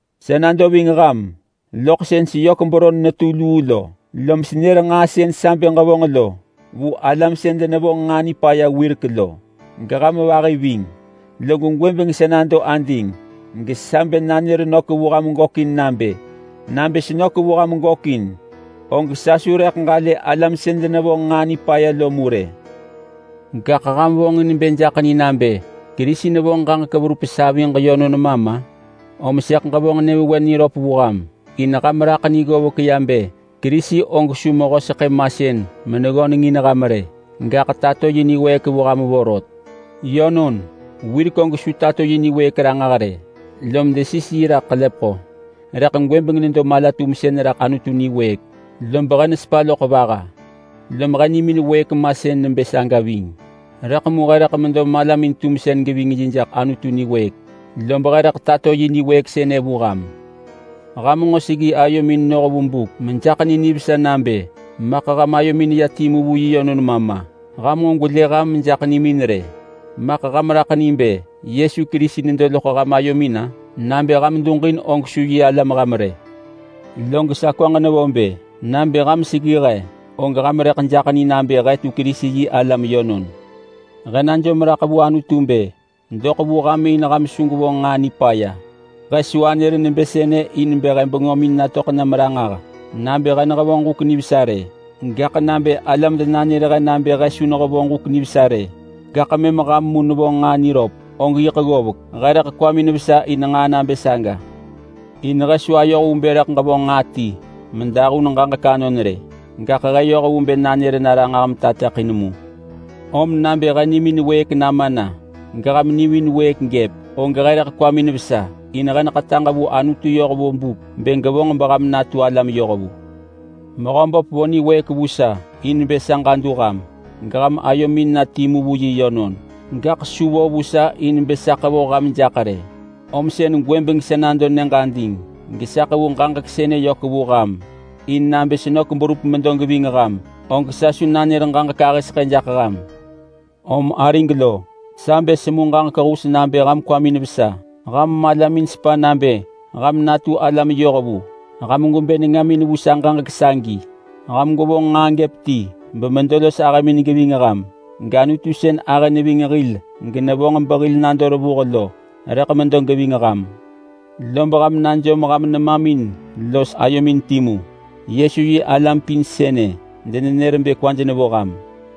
Sa nado ving ham loḳ sën seyök beron netu luu lo, lom senër nġaa sën sa bë ġevonġ lo vu alam sën denevonġ nġaa nipaya wirek lo, geham vahi ving. Log gwëbeng sa nado ading gesa bë nanër nök vu ham gökin nabë: Nabë senök vu ham gökin, og sa su rëḳ ġalë alam sën denevonġ nġaa nipaya lo mu rë. Gaḳ ham vonġin bë jaḳ ni nabë Kerisi nevonġ ġaġek verup saviġ, om sëḳ ġevonġ nyëvewen niröp vu sir. In ham raḳ ni ggovek ya bë Kerisi og su mehö seḳë masën meneggöneng in ham rë. Gaḳ tato yi niwëëk vu ham vorot. Yönon, wirek og su tato yi niwëëk ranġah rë, lom desis yi raḳ ḳelepeḳo, rëḳ gwëbeng nedo mala-tumsën raḳ Anutu niwëëk. Lob he nesepa loḳ vaha, lom he nimin wëëk masën nebë saga ving. Rëḳ mu he rëḳ medo malamin-tumsën geving yi jaḳ Anutu niwëëk, lob he rëḳ tato yi niwëëk sënë vu ham. Ham nġo seggi ayomin noh vu buk mejaḳ ni nivesa nabë maḳ ham ayomin neya timu vu yi yönon ma ma! Ham nġo gwelë ham mejaḳ ni rë! Maḳ ham raḳ ni bë Yesu Kerisi nedo loḳ ham ayomin-a? Nabë ham duġin og su yi alam ham rë. Log sa kwaġ nevo bë: Nabë ham seggi he, og ham rëḳ jaḳ ni nabë he tu Kerisi-yi-alam yönon. He najom raḳ vu Anutu bë doḳ vu ham in ham su gwevonġ nġaa nipaya. He su anër nebë sënë in bë he bengömin natöḳ nam ranġah nabë he nehevonġ huk nivesa rë. Gaḳ nabë alam denanër he nabë he su nehevonġ huk nivesa rë gaḳ mëm ham mu nevonġ nġaa niröp, og yiḳ ggovek. He rëḳ kwamin vesa in nġaa nabë saga. In he su ayoh vu bë rëḳ ġevonġ nġaa ti medahun ġaġek anon rë, gaḳ he yoh vu bë nanër na ranġah metateḳin mu. Om nabë he nimin wëëk nama geham nimin wëëk gëp, og he rëḳ kwamin vesa, in he neḳetaġ vu Anutu yoh vu buk bë gevonġ beham natu alam yohvu. Mehöböp vo niwëëk vu sa in bë sa ġadu ham geham ayomin na timu vu yi yönon. Gaḳ su vo vu sa in bë sa ḳevoh ham jaḳ rë, om sën gwëbeng sa nado nyëġ ading gesa ḳevu ġaġek sënë yök vu ham in bë nabë senök berup medo geving ham, og sa su nanër ġaġek ahë seḳë jaḳ ham. Om arig lo, sa bë semu ġaġek hus nabë ham kwamin vesa. Ham malamin sepa nabë ham natu alam yohvu. Ham gwebë nengamin vu sa ġaġek sagi! Ham gwevonġ nġaa gëp ti bemedo los ahëmin geving ham. GAnutu sën ahë neving hil genevonġ behil nado revuh lo rëḳ medo geving ham. Lob ham najom ham nemamin los ayomin timu. Yesu yi alam pin sënë denenër bë kwaj nevo ham.